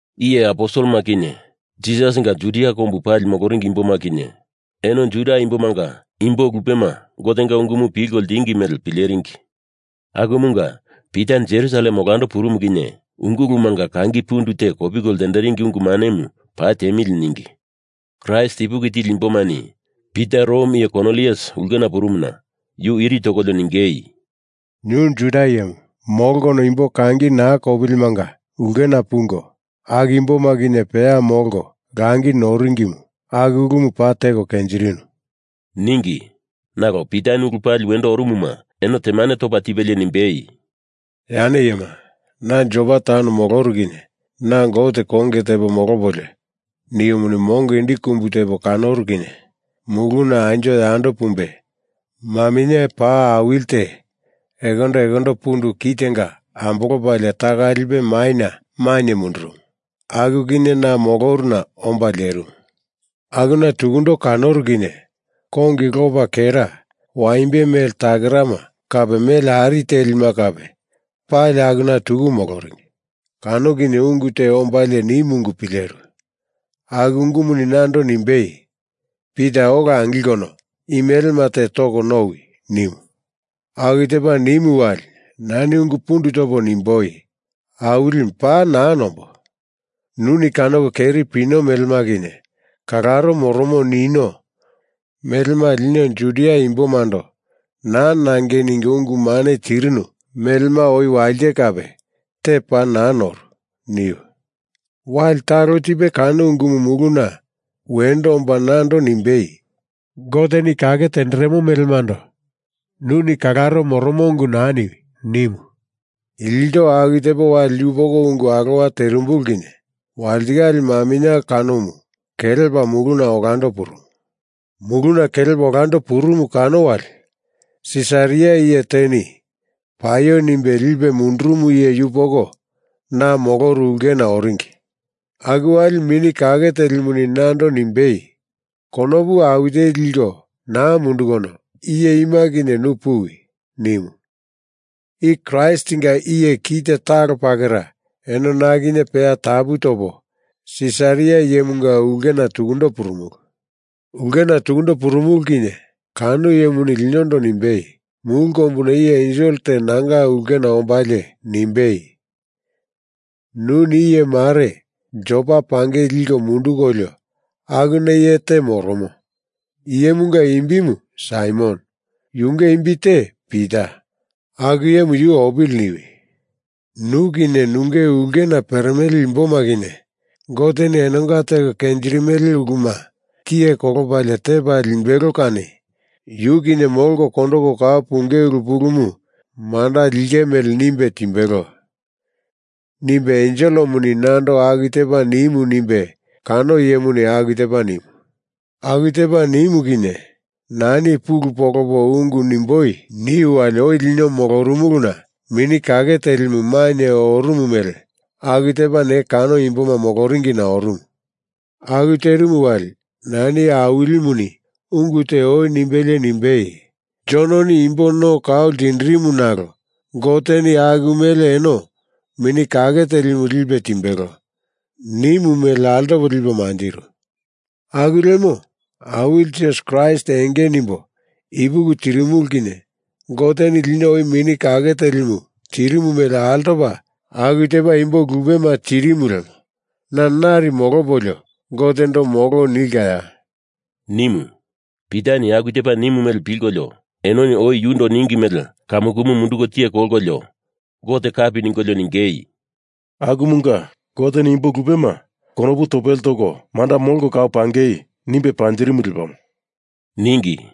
Iye aposelema kinye Jisasinga Judia kombu pali moloringi imboma kinye eno Juda imbomanga imbo lupema Gotenga ungumu pilko ltingi mele pileringi. Akumunga Pita Jerusalem olando purumu kinye ungulumanga kangi pundu te kopiko lteringi ungu manemu paa teamili ningi Kraist ipuki tili imbomani Pita Rom iye Kornilius ulkena purumuna yu iri tokolio ningei, “Nu Judia iyemu molkono imbo kangi naa kopilimanga ulkena pungo, aku imboma kinye peya molko langi noringimu aku ulumu paa teko kenjirinu,” ningi. Nalo Pitani ulu pali wendo orumuma eno temane topa tipelie nimbei, “Yane iyema, na Jopa taun moloru kinye na Gote konge tepo molopolio niumuni mongo indi kumbu tepo kanoru kinye muluna anjo yando pumbe maminye paa awili te ekondo ekondo pundu kitenga ambolopalie taka lipe maina mainye mundurumu. Aku kinye na moloruna omba lerimu. Akuna tukundo kanoru kinye kongi lopa kera waimbe mele takerama kape mele ari telima kape pali akuna tuku moloringi. Kano kinye ungu te ombalie nimu ungu pileru. Aku ungumuni nando nimbei, ‘Pita ola angilkono i melema te toko nowi,’ nimu. Aku tepa nimu wali nani ungu pundu topo nimboi, ‘Awilimu paa naa nombo. Nuni kanoko keri pino melema kinye kalaro moromo nino melema lino Judia imbomando naa nangei ningo ungu mane tirinu melema oi walite kape, te paa naa noru,’ niu. Wali talo tipe kano ungumu muluna wendo omba nando nimbei, ‘Goteni kake tenderemo melemando nuni kalaro moromo ungu naa niwi,’ nimu. Ilto aku tepo wali yupoko ungu alowa terimbulu kinye walitikale maminye kanomu kelepa muluna olando purumu. Muluna kelepa olando purumu kano wali Sisaria iye teni paio nimbe lipe mundurumu iye yupoko na moloru ulkena oringi. Aku wali Mini Kake Telimuni nando nimbei, ‘Konopu awi teli liko naa mundukono iye ima kinye nu puwi,’ nimu. I Kraistinga iye kite talo pakera eno na kinye peya tapu topo Sisaria iyemunga ulkena tukundo purumulu. Ulkena tukundo purumulu kinye kano iyemuni linondo nimbei, ‘Mulu kombuna iye ensel te nanga ulkena ombalie nimbei, “Nuni iyemare Jopa pangei liko mundukolio akuna iye te moromo, iyemunga imbimu Saimon, yunge imbi te Pita, aku iyemu yu opili,” niwi. Nu kinye nunge ulkena peremele imboma kinye Goteni enonga teko kenjirimele uluma tiye kolopalie tepa limbelo kani yu kinye molko kondoko kau punge ulu pulumu manda linge mele nimbe timbelo,’ nimbe enselemuni nando aku tepa nimu nimbe kano iyemuni aku tepa nimu. Aku tepa nimu kinye nani pulu polopo ungu nimboi niu wali oi lino molorumuluna Mini Kake Telimu mainye orumu mele aku tepa ne kano imboma moloringina orumu. Aku terimu wali nani Awilimuni ungu te oi nimbelie nimbei, ‘Jononi imbo no kau ltindirimu nalo Goteni aku mele eno Mini Kake Telimu lipe timbelo’ nimu mele altopo lipo manjiru. Aku lemo Awili Jisas Kraist enge nimbo ipuki tirimulu kinye Goteni lino oi Mini Kake Telimu tirimu mele altopa aku tepa imbo lupema tirimu lemo na nari molopolio Gotendo molo nilkaya?” nimu. Pitani aku tepa nimu mele pilkolio enoni oi yundo ningi mele kamu kumu munduko tiye kolkolio, Gote kapi ningolio ningei, “Akumunga Goteni imbo lupema konopu topele toko manda molko kau pangei nimbe panjirimu lepamo,” ningi.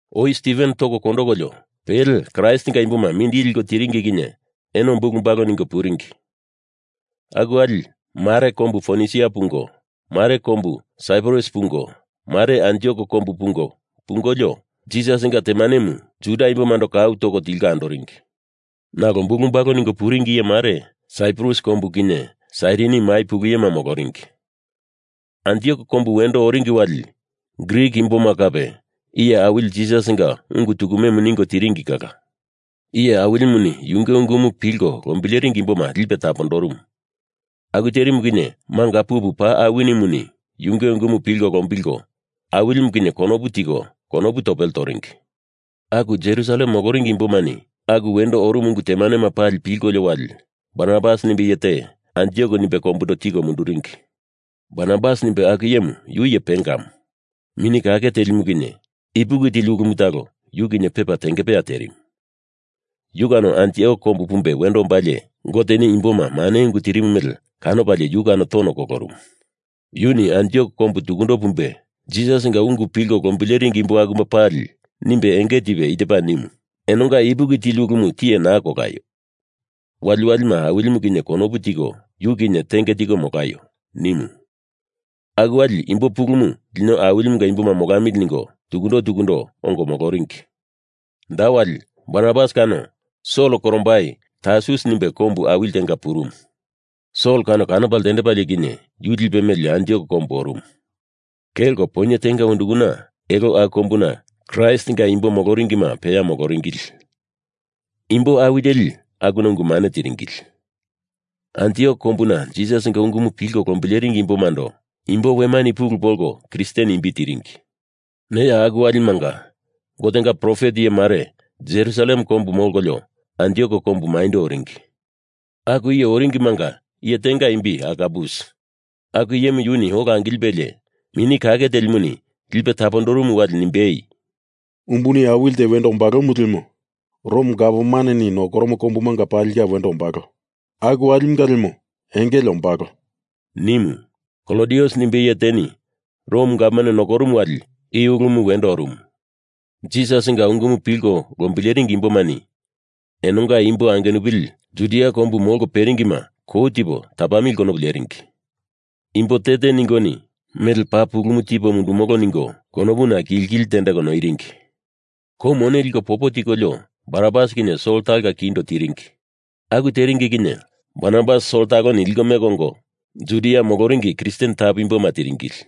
Oi Stiven toko kondokolio pele Kraistinga imboma mindili liko tiringi kinye eno bulu bala ningo puringi. Aku wali mare kombu Fonisia pungo, mare kombu Saiprus pungo, mare Antiok kombu pungo pungolio Jisasinga temanemu Juda imbomando kau toko tilko andoringi. Nalo bulu bala ningo puringi iye mare Saiprus kombu kinye Sairini mai pulu iyema moloringi. Antiok kombu wendo oringi wali Grik imboma kape Iye Awili Jisasinga ungu tukume ningo tiringi kala. Iye Awilimuni yunge ungumu pilko lombileringi imboma lipe tapondorumu. Aku terimu kinye manga pupu paa awinimuni yunge ungumu pilko lombilko Awilimu kinye konopu tiko konopu topele toringi. Aku Jerusalem moloringi imbomani aku wendo orumu ungu temanema pali pilkolio wali Barnabas nimbe iye te Antiok nimbe kombundo tiko munduringi. Barnabas nimbe aku iyemu yu iye pengamu. Mini Kake Telimu kinye ipuki tili ulumu talo yu kinye pepa tengepeya terimu. Yu kano Antiok kombu pumbe wendo ombalie Goteni imboma mane ungu tirimu mele kanopalie yu kano tono kolorumu. Yuni Antiok kombu tukundo pumbe Jisasinga ungu pilko lombileringi imbo akuma pali nimbe enge tipe i tepa nimu, ‘Enonga ipuki tili ulumu tiye naa kolaio. Waliwalima Awilimu kinye konopu tiko yu kinye tenge tiko molaio,’ nimu. Aku wali imbo pulumu lino Awilimunga imboma molamili ningo tukundo tukundo ongo moloringi. Da wali Barnabas kano Sol korombai Tarsus nimbe kombu awili tenga purumu. Sol kano kanopa ltendepalie kinye yu lipe meli Antiok kombu orumu. Kelko poinye tenga undukana elo aku kombuna Kraistinga imbo moloringima peya moloringili. Imbo awi teli akuna ungu mane tiringili. Antiok kombuna Jisasinga ungumu pilko lombileringi imbomando imbo wemani pulu polko Kristen imbi tiringi. Neya aku walimanga Gotenga profet iye mare Jerusalem kombu molkolio Antiok kombu maindo oringi. Aku iye oringimanga iye tenga imbi Agabus. Aku iyemu yuni ola angilipelie Mini Kake Telimuni lipe tapondorumu wali nimbei, “Umbuni awili te wendo ombalomu lemo Rom Gavmaneni nokoromo kombumanga palinga wendo ombalo. Aku walimunga lemo engele ombalo,” nimu. (Klodius nimbe iye teni Rom gavman nokorumu wali i ulumu wendo orumu.) Jisasinga ungumu pilko lombileringi imbomani enonga imbo angenupili Judia kombu molko peringima kou tipo tapamili konopu leringi. Imbo te te ningoni mele paa pulumu tipo mundumolo ningo konopuna kili kili tendeko noiringi. Kou mone liko popo tikolio Barnabas kinye Sol talonga kindo tiringi. Aku teringi kinye Barnabas Sol taloni liko meko ongo Judia moloringi Kristen tapu imboma tiringili.